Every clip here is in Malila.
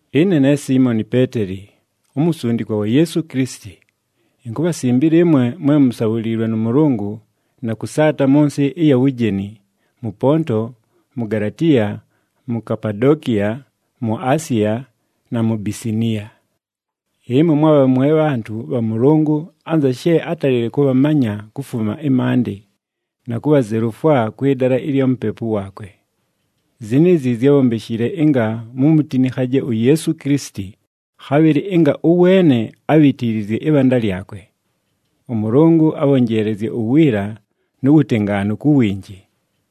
Ɨne ne Siimoni Peeteli, umusundikwa wa Yeesu Kilisiti. Inkubhasimbila ɨmwe mwe musabhuliilwe nʉ Mʉlʉngʉ na kʉsaata mʉ nsɨ ɨya wujeni, mʉ Ponto, mu Galatiya, mu Kapadokiya, mu Asiya na mu Bisiniya. Ɨmwe mwabha mwe bhantʉ bha Mʉlʉngʉ anza she átalile kʉbhamanya kufuma ɨmaandɨ, na kubhazelufwa kwɨ dala ɨlya Mupepu waakwe. Ziniizi zyábhombeshile ɨnga mumutinikhaje uYeesu Kilisiti, khabhɨlɨ ɨnga ʉweene abhitiilizye ɨbhanda lyakwe. ɄMʉlʉngʉ abhonjeelezye uwiila nu wutengaanu ku winji.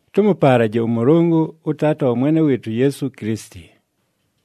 Tʉmʉpaalaje ʉMʉlʉngʉ ʉTaata wa Mwene wɨɨtʉ uYeesu Kilisiti!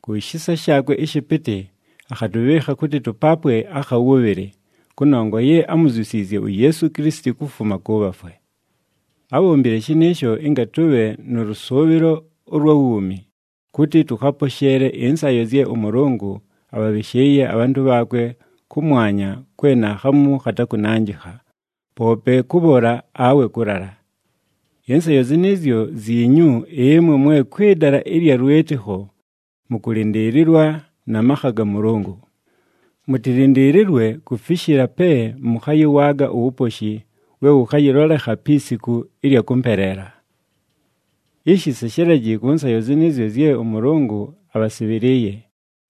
Ku shisa shaakwe ɨshɨpɨtɨ akhatʉbhɨɨkha kʉtɨ tʉpaapwe akha wʉbhɨlɨ, kʉnongwa ye ámuzyusiizye uYeesu Kilisiti kufuma kʉ bhafwe. Ábhombile shɨnɨɨsho ɨnga tʉbhe nʉ lʉsʉʉbhɨlo ʉlwa wuumi, kʉtɨ tʉkhaposheele ɨnsayo zye ʉMʉlʉngʉ abhabhɨshɨɨye abhantʉ bhaakwe kʉmwanya kwe naakhamu khatakʉnanjɨkha, poope kʉbhola awe kʉlala. Ɨnsayo zɨnɨɨzyo zyinyu ɨmwe mwe kwɨ dala ɨlya lwɨtɨkho, mʉkʉlɨndɨɨlɨlwa na makha ga Mʉlʉngʉ. Mʉtɨlɨndɨɨlɨlwe kufishila pe mʉkhayɨwaaga uwuposhi we wʉkhayɨlolekha pi siku ɨlya kʉmpeleela. Ishi seshelaji kʉ nsayo zɨnɨɨzyo zye ʉMʉlʉngʉ abhasɨbhɨlɨɨye,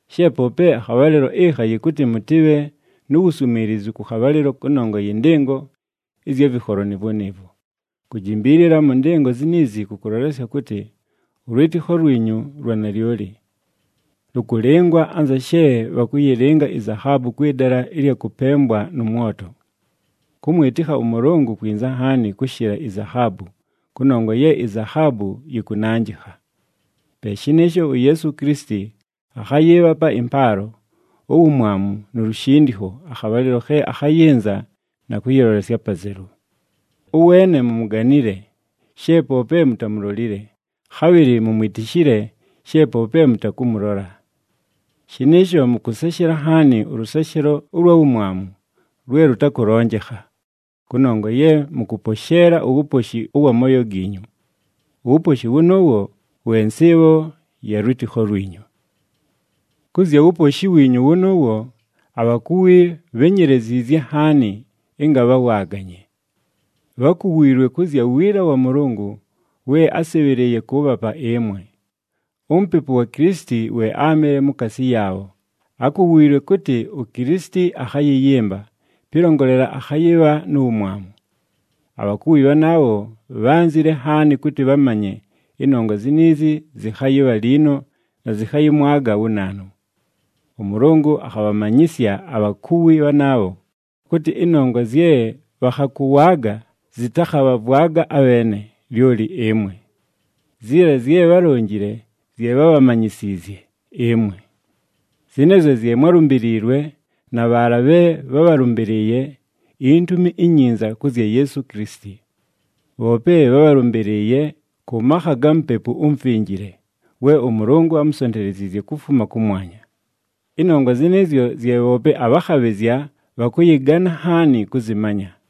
she poope akhabhalɨlo ɨkha yɨkʉtɨ mʉtɨbhe nu wuswimiilizu kʉ khabhalɨlo kʉnongwa yɨ ndɨngo ɨzya vɨkholo nɨɨvwo nɨɨvwo. Kujimbiilila mʉ ndɨngo ziniizi kʉkʉlolesya kʉtɨ, ʉlwɨtɨkho lwinyu lwa nalyoli. Lʉkʉlɨngwa anza she bhakʉyɨlɨnga izahaabu kwɨ dala ɨlya kʉpembwa nʉ mwoto. Kʉmwɨtɨkha ʉMʉlʉngʉ kwinza nhaani kʉshɨla izahaabu, kʉnongwa ye izahaabu yɨkʉnanjɨkha. Pe shɨnɨɨsho, uYeesu Kilisiti akhayɨɨbhapa ɨmpaalo, uwumwamu nu lushindikho akhabhalɨlo khe akhayɨnza na kʉyɨlolesya apazelu. Ʉweene mumuganile, she poope mutamulolile, khabhɨlɨ mumwitishile she poope mʉtakʉmʉlola. Shɨnɨɨsho mʉkʉseshela nhaani ʉlʉseshelo ʉlwa wumwamu, lwe lʉtakʉlonjekha, kʉnongwa ye mʉkʉposheela uwuposhi ʉwa mooyo giinyu. Uwuposhi wʉnʉʉwo we nsɨɨbho ya lwɨtɨkho lwinyu. Kʉ zya wuposhi wiinyu wʉnʉʉwo, abhakuwi bhényeleziizye nhaani ɨnga bhawaaganye. Bhákuwiilwe kʉ zya wiila wa Mʉlʉngʉ we ásɨbhɨlɨɨye kʉʉbhapa ɨmwe. UMupepu wa Kilisiti we áamɨle mukaasi yaabho, ákuwiilwe kʉtɨ uKilisiti akhayɨyɨmba, pɨlongolela akhayɨbha nu wumwamu. Abhakuwi bhanaabho bhánzile nhaani kʉtɨ bhamanye ɨnongwa ziniizi zɨkhayɨbha liino na zɨkhayɨmwaga wu naanu. ɄMʉlʉngʉ akhabhamanyɨsya abhakuwi bhanaabho kʉtɨ ɨnongwa zye bhakhakʉwaaga zɨtakhabhavwaga abheene, lyoli ɨmwe. Ziila zye bhálonjile zye bhábhamanyisiizye ɨmwe. Zɨnɨɨzyo zye mwálumbiliilwe na bhaala bhe bhábhalʉmbɨlɨɨye iNtumi iNyinza kʉ zya Yeesu Kilisiti. Bhoope bhábhalʉmbɨlɨɨye kʉ makha ga Mupepu uMufinjile we ʉMʉlʉngʉ ámusonteleziizye kufuma kʉmwanya. Ɨnongwa zɨnɨɨzyo zye bhoope abhakhabhɨzya bhakʉyɨgana nhaani kʉzɨmanya.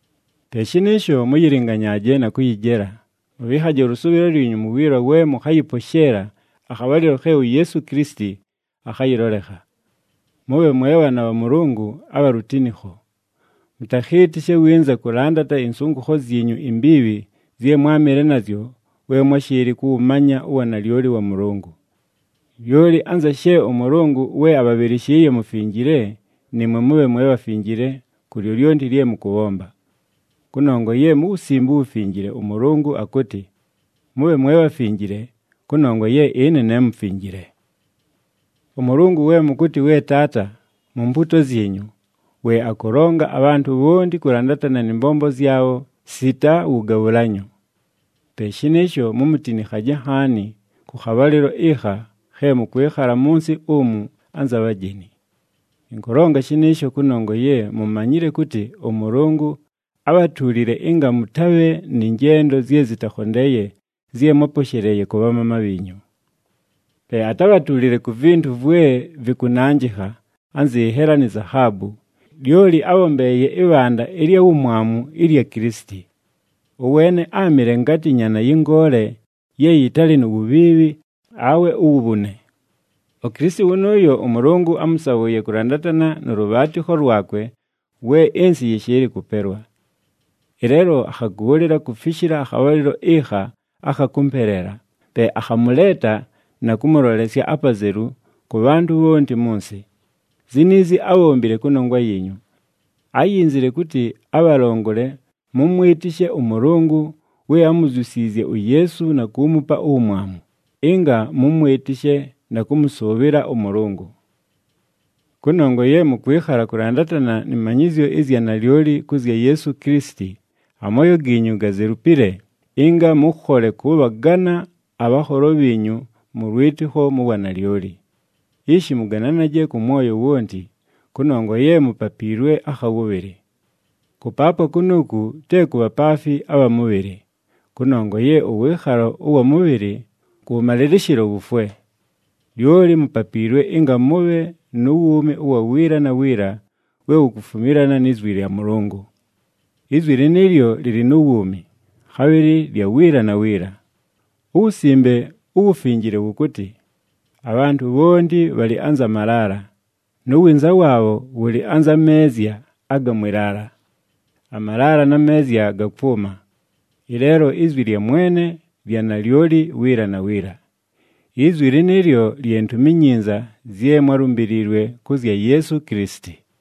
Pe shɨnɨɨsho, mʉyɨlɨnganyaaje na kʉyɨjela, mʉbhɨɨkhaje ʉlʉsʉʉbhɨlo lwinyu mu wiila we mʉkhayɨposheela akhabhalɨlo khe uYeesu Kilisiti akhayɨlolekha. Mʉbhe mwe bhaana bha Mʉlʉngʉ abha lutinikho. Mʉtakhɨɨtɨshe winza kʉlandata ɨnsʉngʉkho zyinyu imbiibhi zye mwámɨle nazyo we mwáshɨɨlɨ kʉwʉmanya uwanalyoli wa Mʉlʉngʉ. Lyoli anza she ʉMʉlʉngʉ we abhabhɨlɨshɨɨye mufinjile, nɨɨmwe mʉbhe mwe bhafinjile ku lyolyonti lye mʉkʉbhomba. Kʉnongwa ye mu Wusimbe uWufinjile ʉMʉlʉngʉ akʉtɨ, “Mʉbhe mwe bhafinjile, kʉnongwa ye ɨne ne mufinjile.” ɄMʉlʉngʉ we mʉkʉtɨ, “we Taata,” mu mpuuto zyinyu, we akʉlonga abhantʉ bhonti kʉlandatana nɨ mbombo zyabho sita wʉgabhʉlanyo. Pe shɨnɨɨsho, mumutinikhaje nhaani kʉ khabhalɨlo ɨkha khe mʉkwɨkhala mʉ nsɨ umu anza bhajeni. Ɨnkʉlonga shɨnɨɨsho kʉnongwa ye mumanyile kʉtɨ ʉMʉlʉngʉ ábhatuulile ɨnga mʉtabhe nɨ njendo zye zɨtakhondeeye zye mwáposheleeye kʉ bhamaama bhiinyu. Pe atábhatuulile ku vintu vwe vɨkʉnanjɨkha anzɨ nhela ni zahaabu, lyoli ábhombeeye ɨbhanda ɨlya wumwamu ɨlya Kilisiti. Ʉweene áamɨle ngatɨ nyaana yɨ ngoole ye yɨtalɨ nu wubhiibhi awe uwubhune. UKilisiti wʉnʉʉyo ʉMʉlʉngʉ ámʉsabhʉʉye kʉlandatana nʉ lʉbhaatɨkho lwakwe we ɨnsɨ yɨshɨɨlɨ kʉpelwa. Ɨleelo akhagʉʉlɨla kufishila akhabhalɨlo ɨkha akha kʉmpeleela, pe akhamʉleeta na kʉmʉlolesya apazelu kʉ bhantʉ bhonti mʉ nsɨ. Ziniizi ábhombile kʉnongwa yiinyu. Áyinzile kʉtɨ abhalongole mʉmwɨtɨshe ʉMʉlʉngʉ we ámuzyusiizye uYeesu na kuumupa uwumwamu, ɨnga mʉmwɨtɨshe na kʉmʉsʉʉbhɨla ʉMʉlʉngʉ. Kʉnongwa ye mʉkwɨkhala kʉlandatana nɨ manyɨzyo ɨzya nalyoli kʉ zya Yeesu Kilisiti, amooyo giinyu gazelupile ɨnga mʉkhole kʉbhagana abhanholo bhiinyu mʉ lwɨtɨkho mu wanalyoli. Ishi mʉgananaje kʉ mwoyo wonti, kʉnongwa ye mupapiilwe akha wʉbhɨlɨ. Kʉpaapwa kunuuku te ku bhapaafi abha mʉbhɨlɨ, kʉnongwa ye ʉwɨɨkhalo ʉwa mʉbhɨlɨ, kʉwʉmalɨlɨshɨlo wufwe. Lyoli mupapiilwe ɨnga mʉbhe nu wuumi ʉwa wiila na wiila we wukufumilana ni zwi lya Mʉlʉngʉ. Izwi lɨnɨɨlyo lɨlɨ nu wuumi, khabhɨlɨ lya wiila na wiila. UWusimbe uWufinjile wʉkʉtɨ, “Abhantʉ bhonti bhalɨ anza malaala, nu winza waabho wʉlɨ anza meezya aga mwɨ laala. Amalaala na meezya gakwʉma, ɨleelo izwi lya Mwene lya nalyoli wiila na wiila.” Izwi lɨnɨɨlyo lye Ntumi iNyinza zye mwálumbiliilwe kʉ zya Yeesu Kilisiti.